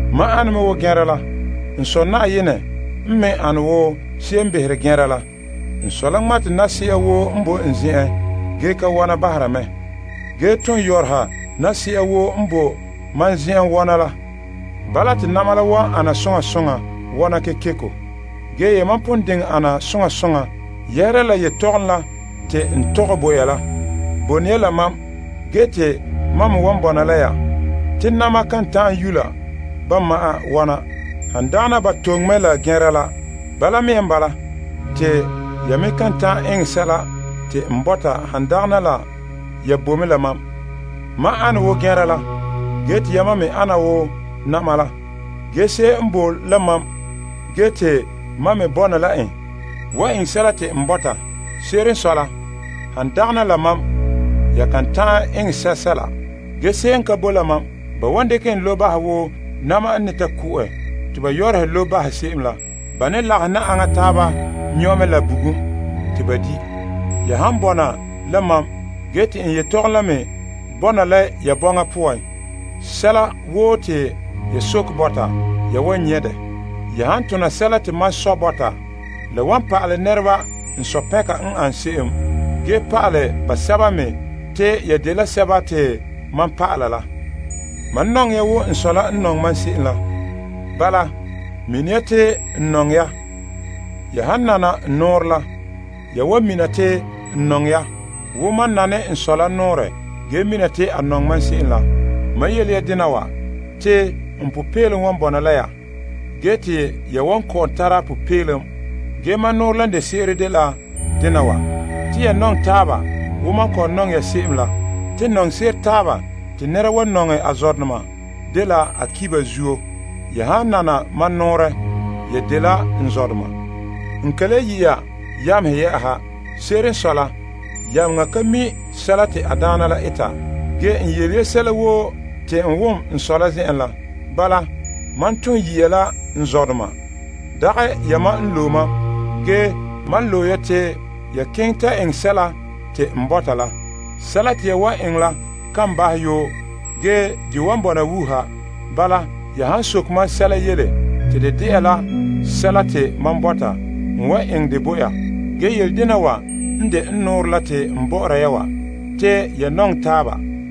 Mam ane me wo tia te ba sɛ' la. N Sɔ Na'ayenɛ n me ane wo se'em n behere tia la. N Sɔ la ŋmate yila se'a woo n boe n zen'en ge ka wɔna bahera mɛ. Ge ton yɔrɔha yila se'a woo n boe mam zen'en wɔna la. Bala, te na'ma la wan ana soŋa soŋa wɔna kekeko. Ge yamam pon diŋɛ ana soŋa soŋa yɛhera la yetɔgɔm la te n tɔgɛ bo ya la. Bone ya la mam, ge te mam me wan bɔna la ya. Te yila kan ta'an yula ba ma'an wɔna, han dagana ba toŋe mɛ la tia la. Bala mea n bala, te ya me kan ta'an eŋɛ sɛla te n bɔta han dagana la ya boe mɛ la mam. Mam ana wo tia la, ge te yamam me ana wo yila la. Ge se'em n boe la mam ge te mam me bɔna la en wan eŋɛ sɛla te n bɔta. Se'ere n sɔe la, han dagana la mam, ya kan ta'an eŋɛ sɛsɛla. Ge se'em n ka bo la mam, ba wan dekɛ en lobe bahɛ wo yila n ne ta ko'ɛ te ba yɔrɔhe lobe bahɛ se'em la. Ba ne lagahɛ yila aŋa taaba nyɔ' mɛ la bugum te ba di'. Ya han bɔna la mam ge te n yelehom la me bɔna la ya bɔŋa poan, sɛla woo te ya sokɛ bɔta, ya wan nyɛ' dɛ. Ya han tona sɛla te mam Sɔ bɔta, la wan pa'alɛ nɛreba n Sɔ pɛnka n ane se'em, ge pa'alɛ basɛba me te ya dela mam dɔlɔba la. Mam nɔŋɛ ya wo n Sɔ la n nɔŋɛ mam se'em la. Bala, mina ya te n nɔŋɛ ya. Ya han nana n nɔɔrɛ la, ya wan mina te n nɔŋɛ ya wo mam nane n Sɔ la nɔɔrɛ ge mina te a nɔŋɛ mam se'em la. Mam yele ya dena wa te n popeelom wan bɔna la ya. Ge te ya wan kɔ'ɔn tara popeelom. Ge mam nɔɔrɛ la n de se'ere la dela dena wa. Te ya nɔŋɛ taaba wo mam kɔ'ɔn nɔŋɛ ya se'em la. Te nɔŋse'ere taaba te nɛra wan nɔŋɛ a zɔdoma dela a ki' ba zuo. Ya han nana mam nɔɔrɛ, ya dela n zɔdoma. N ka le yi' ya yamehe yɛ'ɛha. Se'ere n sɔe la, yameŋa ka mi' sɛla te a daana la eta. Ge, n yele ya sɛla woo te n wom n Sɔ la zen'en la. Bala, mam ton yi ya la n zɔdoma. Dagɛ yamam n loe mam. Ge, mam loe ya te ya keŋɛ la ya ta eŋɛ sɛla te n bɔta la. Sɛla te ya wan eŋɛ la kan bahɛ yoo, ge de wan bɔna wuuha. Bala, ya han soke mam Sɔ sɛla yele mam yu'urɛ poan, a wan eŋɛ dɛ bo ya. Ge yele dena wa n de n nɔɔrɛ la te n bɔ'ɔra ya wa, te ya nɔŋɛ taaba.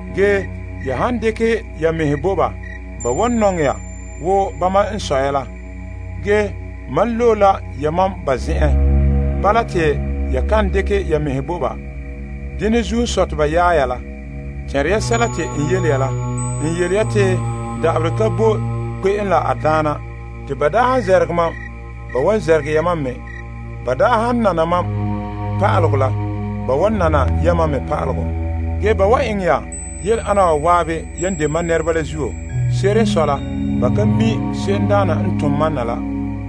Ge ya han dekɛ ya mɛhe bo teŋa wa, ba wan nɔŋɛ ya wo ba dene la. Ge, mam loe la yamam mɛ yehe teŋa wa zuo. Bala te ya kan dekɛ ya mɛhe bo ba. Dene zuo n sɔe te ba yaɛ ya la. Tɛnre ya sɛla te n yele ya la: n yele ya te da'aberɛ ka bo kpe'em la a daana. Te ba daa han namehe mam, ba wan namehe ya mam me. Ba daa han nana mam pa'alegɔ la, ba wan nana yamam me pa'alegɔ. Ge, ba wan eŋɛ ya yele ana wa zan'an yan de mam nɛreba la zuo. Se'ere n sɔe la, ba ka mi' se'emdaana n tom mam na la.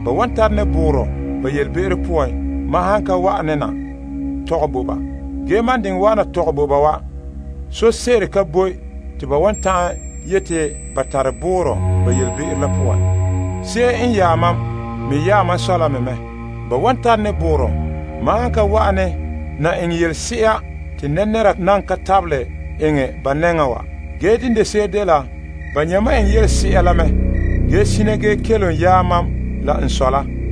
Ba wan tare ne boorɔ ba yelebe'ero poan mam han ka wa'ane na tɔgɛ bo ba. Ge mam n diŋɛ wa'ana tɔgɛ bo ba wa, sose'ere ka boe te ba wan ta'an yeti ba tare boorɔ ba yelebe'ero la poan. Se'em n yaɛ mam me yaɛ mam Sɔ la me mɛ. Ba wan tare ne boorɔ mam han ka wa'ane na eŋɛ yelese'a te nɛra nan ka tabelɛ eŋɛ ba nɛŋa wa. Ge, dene de se'ere la, ba nyɛ' mam eŋɛ yelese'a la mɛ ge sina ge kelom yaɛ mam la n Sɔ la.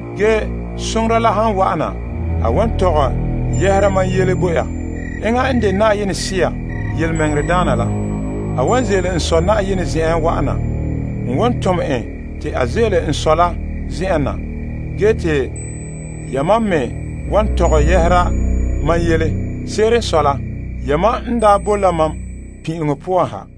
Ge Soŋora la han wa'ana, a wan tɔgɛ yɛhera mam yele bo ya. Enŋa n de Na'ayenɛ Sea Yelemɛŋɛrɛdaana la. A wan ze'ele n Sɔ Na'ayenɛ zen'en wa'ana. N wan tom en te a ze'ele n Sɔ la zen'en na. Ge te yamam me wan tɔgɛ yɛhera mam yele. Se'ere n sɔe la, yamam n daa boe la mam pin'ileŋɔ poan ha.